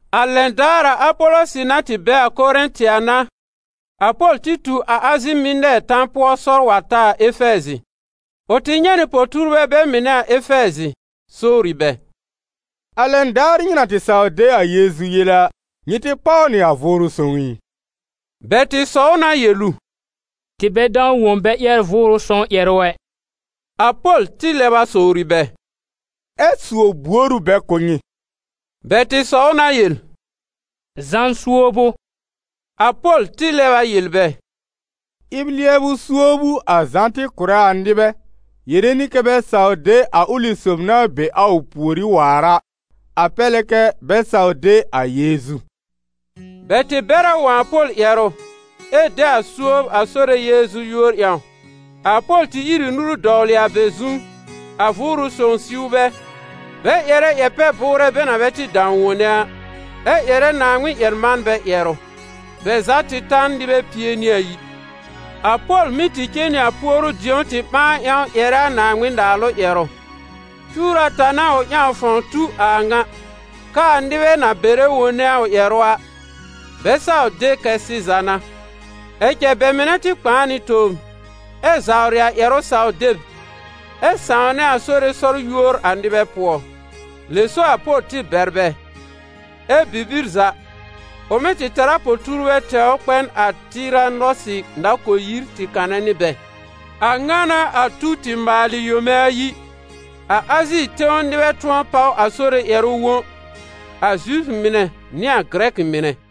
A lɛn daar a Apɔlɔsɩ na tɩ be a Korɛ̃tɩ a n'a, a Pol tɩ tu Azi Mɩnɛɛr tan pʋɔ sɔr wa ta a Efɛɛzɩ. Ʋ tɩ nyɛ̃ nɩ po-tuurbɛ bɛ mɩnɛ a Efɛɛzɩ, sowri bɛ: «A lɛn daar nyɩ na tɩ saw de a Yeezu yele a, nyɩ tɩ páw nɩ a Vʋʋrʋ Sõw ɩ?» Bɛ tɩ sɔw na yel ʋ: «Tɩ bɛ dãw wõ bɛ ƴɛr Vʋʋrʋ Sõw ƴɛrʋ ɛ!» A Pol tɩ lɛb a sowri bɛ: «Ɛ́ suob buor ʋ bɛ kʋ̀ nyɩ?» Bɛ tɩ sɔw na yel: «Zã suob ʋ.» A Pol tɩ lɛb a yel bɛ: «Ɩb-lɩɛbʋ suob ʋ a Zã tɩ kʋ̀rɛ a nɩbɛ yere nɩ kɛ́ bɛ saw de a ʋlɩ sob na be a ʋ pùorí waar a, a pɛr lɛ kɛ bɛ saw de a Yeezu.» Bɛ tɩ bɛr a wõ a Pol ƴɛrʋ ɛ de a suob a Sore Yeezu yúor ƴãw. A Pol tɩ ír ɩ nuru dɔwlɩ a bɛ zu, a Vʋʋrʋ sõw siw bɛ, bɛ ƴɛrɛ ƴɛr-pɛ-bʋʋrɛ bɛ na bɛ tɩ dãw wone a, ɛ ƴɛrɛ Naaŋmɩn-ƴɛr-manbɛ ƴɛrʋ. Bɛ za tɩ ta n nɩbɛ pie nɩ ayi. A Pol mɩ́ tɩ cen nɩ a puoru-dĩ̀ó tɩ ɓãa ƴãw ƴɛrɛ a Naaŋmɩn-Naalʋ ƴɛrʋ. Cuwr ata n'a ʋ ƴãw fãw tu a a ŋa, kɛ́ a nɩbɛ na bɛrɛ wone a ʋ ƴɛrʋ a, bɛ saw de kɛ sɩza n'a. Ɛ cɛ bɛ mɩnɛ tɩ kpãa nɩ tobr, ɛ zawrɩ a ƴɛrʋ saw deb ɛ sãwnɛ a Sore sɔr yúor a nɩbɛ pʋɔ. Lɛ so a Pol tɩ bɛr bɛ, ɛ́ bibir za, ʋ mɩ́ tɛr a po-tuurbɛ tɛwr kpɛ n a Tɩranɔsɩ nakol-yir tɩ kanɛ nɩ bɛ. A ŋa n'a a tu tɩ maalɩ yome ayi, a Azi tẽw nɩbɛ tʋ̃ɔ páw a Sore ƴɛrʋ wõ, a Zifʋ mɩnɛ nɩ a Gɩrɛkɩ mɩnɛ.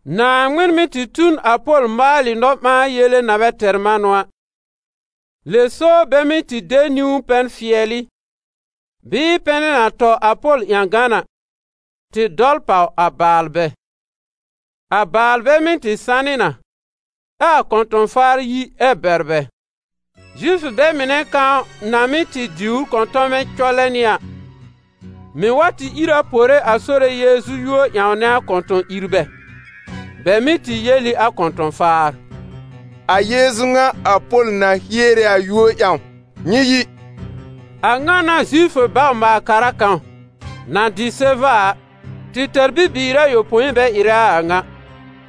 Naaŋmɩn mɩ́ tɩ tu n a Pol maalɩ nɔ-ɓãa-yele na bɛ tɛr manʋ a. Lɛ so bɛ mɩ́ tɩ de niwn-pɛn-fɩɛlɩ, bɩɩ pɛnɛ na tɔ a Pol ƴãgan a, tɩ dɔl pàw a baalbɛ. A baalbɛ mɩ́ tɩ sanɩ na, ɛ a kɔ̃tɔ̃-faar yi ɛ bɛr bɛ. Zifʋ bɛ mɩnɛ kãw na mɩ́ tɩ diwr kɔ̃tɔmɛ cɔlɛ nɩ a, mɩ̀ wa tɩ ìr a pore a Sore Yeezu yúor ƴãwnɛ a kɔ̃tɔ̃-ìrbɛ; bɛ mɩ́ tɩ yel ɩ a kɔ̃tɔ̃-faar: «A Yeezu ŋa a Pol na hiere a yúor ƴãw, nyɩ yi!» A ŋa n'a Zifʋ bawr-maal-kara kãw, na dɩ Seva a, tɩ tɛr bibiir ayopõi bɛ ɩrɛ a a ŋa.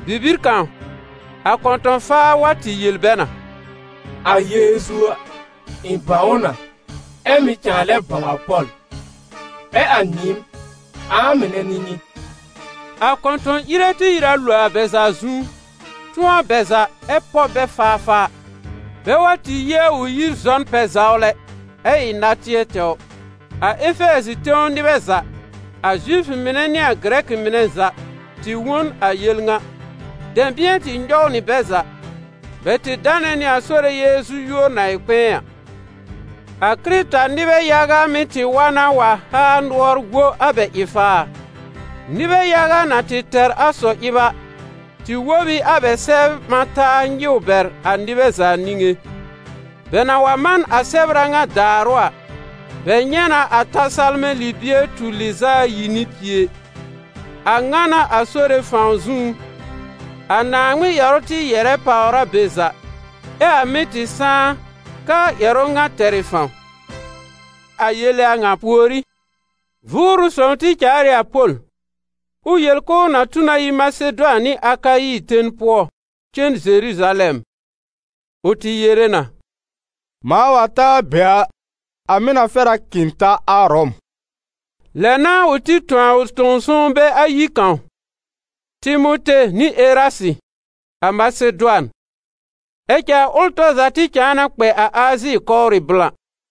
Bibir kãw, a kɔ̃tɔ̃-faa wa tɩ yel bɛ na: «A Yeezu a, ɩ̃ bãw ʋ na, ɛ mɩ̀ cãa lɛ bãw a Pol. Ɛ a nyɩɩm, ã-mɩnɛ n'ɩ nyɩ?» A kɔ̃tɔ̃-ire tɩ ìr a lo a bɛ za zu, tʋ̃ɔ bɛ za ɛ pɔb bɛ faafaa, bɛ wa tɩ yi a ʋ yir zɔ n pɛ-zawlɛ, ɛ ɩ natɩɛ tɛwr. A Efɛɛzɩ tẽw nɩbɛ za, a Zifʋ mɩnɛ nɩ a Gɩrɛkɩ mɩnɛ za, tɩ wõ n a yel ŋa. Dɛ̃bɩ̃ɛ tɩ nyɔw nɩ bɛ za. Bɛ tɩ danɛ nɩ a Sore Yeezu yúor na ɩ kpɛ̃ɛ a. A Kɩrɩta-nɩbɛ yaga mɩ́ tɩ wa na wa haa nʋɔr wo a bɛ ɩ-faar. Nɩbɛ yaga na tɩ tɛr a sɔ-ɩb a, tɩ wob ɩ a bɛ sɛbr ɓã taa nyɩw bɛr a nɩbɛ za niŋé. Bɛ na wa man a sɛbr a ŋa daarʋ a, bɛ nyɛ̃ na a ta salmɛ̃ libie tur lɩz'a ayi nɩ pie. A ŋa n'a a Sore fãw zũú, a Naaŋmɩn ƴɛrʋ tɩ yɛ̀rɛ pàwr a be za. Ɛ a mɩ́ tɩ sãá kɛ a ƴɛrʋ ŋa tɛr ɩ fãw. A yele a ŋa pùorí, Vʋʋrʋ Sõw tɩ caal ɩ a Pol ʋ yel k'ʋʋ na tu na yi Masedʋan nɩ Akayi ten pʋɔ cen Zeruzalɛm. Ʋ tɩ yere na: «Mãa wa ta a be a, a mɩ̀ na fɛr k'ɩ̃ ta a Ʋrɔm.» Lɛ n'a ʋ tɩ tõ a ʋ sõw-sõwnbɛ ayi kãw, Timote nɩ Erasɩ, a Masedʋan. Ɛ cɛ a ʋl tɔr za tɩ cãa na kpɛ a Azi kɔwrɩ blã.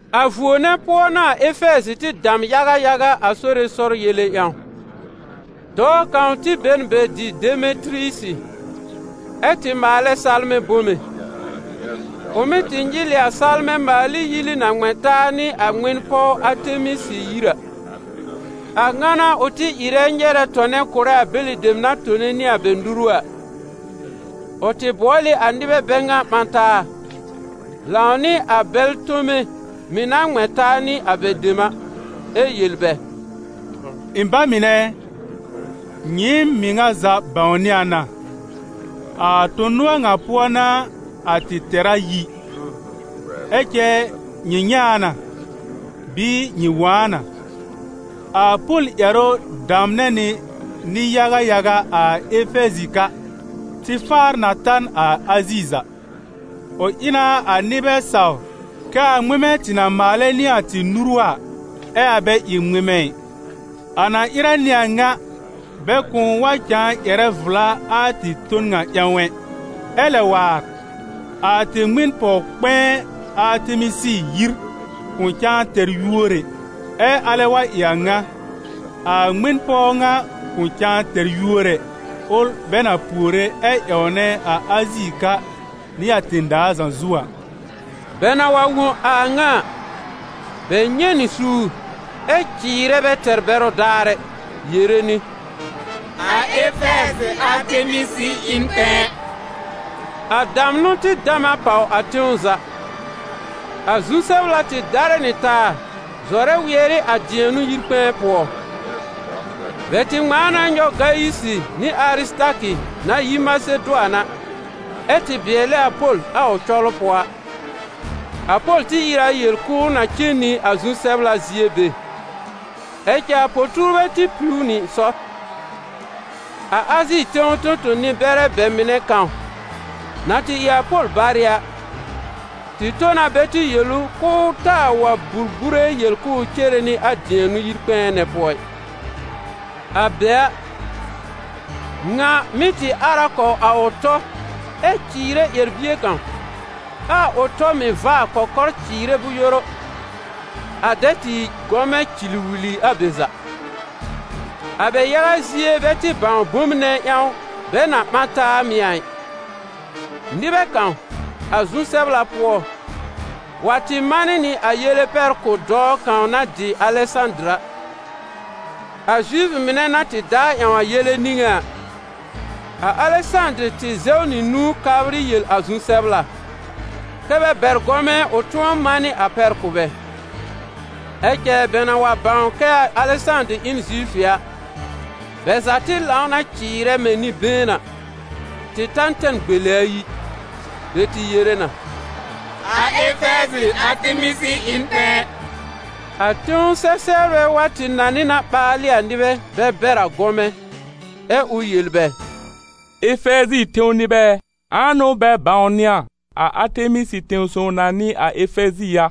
A vuo nɛ pʋɔ n'a a Efɛɛzɩ tɩ dam yaga yaga a Sore sɔr yele ƴãw. Dɔɔ kãw tɩ be n be dɩ Demetɩrɩyisi, ɛ́ tɩ maalɛ salmɛ̃ bome. Ʋ mɩ́ tɩ nyɩl ɩ a salmɛ̃ maal ɩ yili na ŋmɛ̃ taa nɩ a ŋmɩn-pɔw Atemisɩ yir a. A ŋa n'a ʋ tɩ ɩrɛ nyɛrɛ tɔnɛ kʋ̀rɛ a bɛlɩ dem na tɩ tone nɩ a bɛ nuru a. Ʋ tɩ bʋɔl ɩ a nɩbɛ bɛ ŋa ɓã taa, lãw nɩ a bɛl tome mɩ̀ na tɩ ŋmɛ̃ taa nɩ a bɛ dem a, ɛ yel bɛ: «Ɩ̃ ba mɩnɛ ɛ, nyɩɩm mɩŋa za bãwnɩ a na, a tõ-nʋɔr ŋa pʋɔ n'a a tɩ tɛra yi. Ɛ cɛ nyɩ nyɛ̃ a na, bɩɩ nyɩ wõ a na: a Pol ƴɛrʋ damnɛ nɩ nɩ-yaga yaga a Efɛɛzɩ ka, tɩ faar na ta n a Azi za. Ʋ ɩ na a nɩbɛ saw kɛ a ŋmɩmɛ tɩ na maalɛ nɩ a tɩ nuru a, ɛ a bɛ ɩ ŋmɩmɛ ɩ. A na ɩrɛ nɩ a ŋa, bɛ kʋ̃ʋ wa cãa ƴɛrɛ vla a tɩ ton ŋa ƴãw ɛ. Ɛ lɛ waar, a tɩ ŋmɩn-pɔw kpɛ̃ɛ Atemisɩ yir kʋ̃ cãa tɛr yúor ɛ. Ɛ alɛ wa ɩ a a ŋa, a ŋmɩn-pɔw ŋa kʋ̃ cãa tɛr yúor ɛ, ʋl bɛ na puore ɛ ƴãwnɛ a Azi ka nɩ a tẽ-daa za zu a.» Bɛ na wa wõ a ŋa a, bɛ nyɛ̃ nɩ suur ɛ cɩɩrɛ bɛ tɛr bɛrʋ daar ɛ, yere nɩ: «A Efɛɛzɩ Atemisɩ ɩ n kpɛ̃ɛ!» A damnʋ tɩ dam a pàw a tẽw za. A zu-sɛbla tɩ darɛ nɩ taa zɔrɛ wɩɛr ɩ a dɩɛnʋ yir kpɛ̃ɛ pʋɔ. Bɛ tɩ ŋmãa na nyɔw Gayisɩ nɩ Arɩsɩtakɩ na yi Masedʋan, ɛ́ tɩ bɩɛlɛ a Pol a ʋ cɔlʋ pʋɔ a. A Pol tɩ ìr a yel k'ʋʋ na cen nɩ a zu-sɛbla zie be, ɛ cɛ a po-tuurbɛ tɩ piw ʋ nɩ sɔr. A Azi tẽw tõ-tõ-nɩ-bɛrɛ bɛ mɩnɛ kãw, na tɩ ɩ a Pol barɩ a, tɩ tõ na bɛ tɩ yel ʋ k'ʋʋ taa wa burbure yel k'ʋʋ cere nɩ a dɩɛnʋ yir kpɛ̃ɛ nɛ pʋɔ ɩ. A be a, ŋa mɩ́ tɩ ar a kɔw a ʋ tɔ ɛ cɩɩrɛ ƴɛr-bie kãw, ɛ a ʋ tɔ mɩ̀ vaa kɔkɔr cɩɩrɛ bʋ̃-yoru, a dɛ tɩ ɩ gɔmɛ cɩlwɩlɩ a be za! A bɛ yaga zie bɛ tɩ bãw bom nɛ ƴãw bɛ na ɓã taa mɩ̀ a ɩ. Nɩbɛ kãw, a zu-sɛbla pʋɔ, wa tɩ manɩ nɩ a yele pɛr kʋ̀ dɔɔ kãw na dɩ Alɛsãdɩr a, a Zifʋ mɩnɛ na tɩ daa ƴãw a yele niŋé a. A Alɛsãdɩr tɩ zɛw nɩ nũu kabrɩ yel a zu-sɛbla, kɛ́ bɛ bɛr gɔmɛ ʋ tʋ̃ɔ manɩ a pɛr kʋ̀ bɛ. Ɛ cɛ bɛ na wa bãw kɛ a Alɛsãdɩr ɩ n Zifʋ a, bɛ za tɩ lãw na cɩɩrɛ mɛ̃ nɩ-been a, tɩ ta tɛm gbele ayi. Bɛ tɩ yere na: «A Efɛɛzɩ Atemisɩ ɩ n kpɛ̃ɛ!» A tẽw sɛ-sɛbrɛ tɩ wa nanɩ na ɓaalɩ a nɩbɛ bɛ bɛr a gɔmɛ, ɛ ʋ yel bɛ: «Efɛɛzɩ tẽw nɩbɛ ɛ, ãa n'ʋ bɛ bãwnɩ a, a Atemisɩ tẽ-sõw na n'ɩ a Efɛɛzɩ a?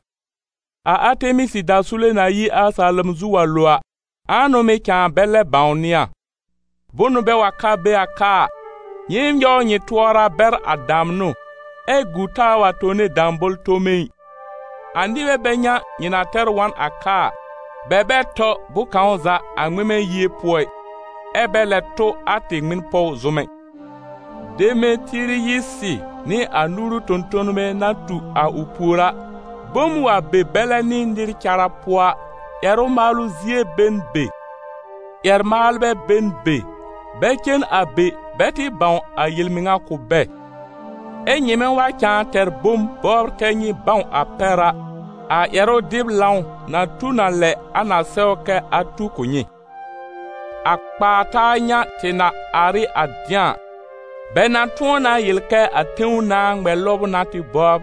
A Atemisɩ dasule na yi a salom zu wa lo a, ãa n'ʋ mɩ̀ cãa bɛ lɛ bãwnɩ a? Bʋnʋ bɛ wa ka be a ka a, nyɩɩm nyɔw nyɩ tʋɔra bɛr a damnʋ, ɛ gu taa wa tone dãbõl-tome ɩ. A nɩbɛ bɛ ŋa nyɩ na tɛr wa n a ka a, bɛ bɛ tɔ bʋ̃-kãw za a ŋmɩmɛ yie pʋɔ ɩ, ɛ bɛ lɛ tʋ a tɩ ŋmɩn-pɔw zʋm ɛ. Demetɩrɩyisi nɩ a nuru tõ-tõnbɛ na tu a ʋ pùor a, bom wa be bɛlɛ nɩ nɩr cara pʋɔ a, ƴɛrʋ maalʋ zie be n be, ƴɛr-maalbɛ be n be, bɛ cen a be bɛ tɩ bãw a yel-mɩŋa kʋ̀ bɛ. Ɛ nyɩmɛ wa cãa tɛr bom bɔbr kɛ nyɩ bãw a pɛr a, a ƴɛrʋ-dɩb-lãw na tu n a lɛ a na sɛw kɛ a tu a kʋ̀ nyɩ. A kpaa-taa ŋa tɩ na ar ɩ a dɩ̃a a, bɛ na tʋ̃ɔ na yel kɛ a tẽw nãà ŋmɛ-lɔbʋ n'a tɩ bɔbr.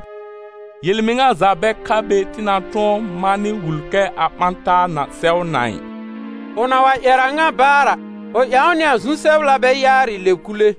Yel-mɩŋa za bɛ ka be tɩ na tʋ̃ɔ manɩ wul kɛ a ɓã-taa ŋa sɛw na ɩ.» Ʋ na wa ƴɛr a a ŋa baar a, ʋ ƴãw nɩ a zu-sɛbla bɛ yaarɩ lɛb kule.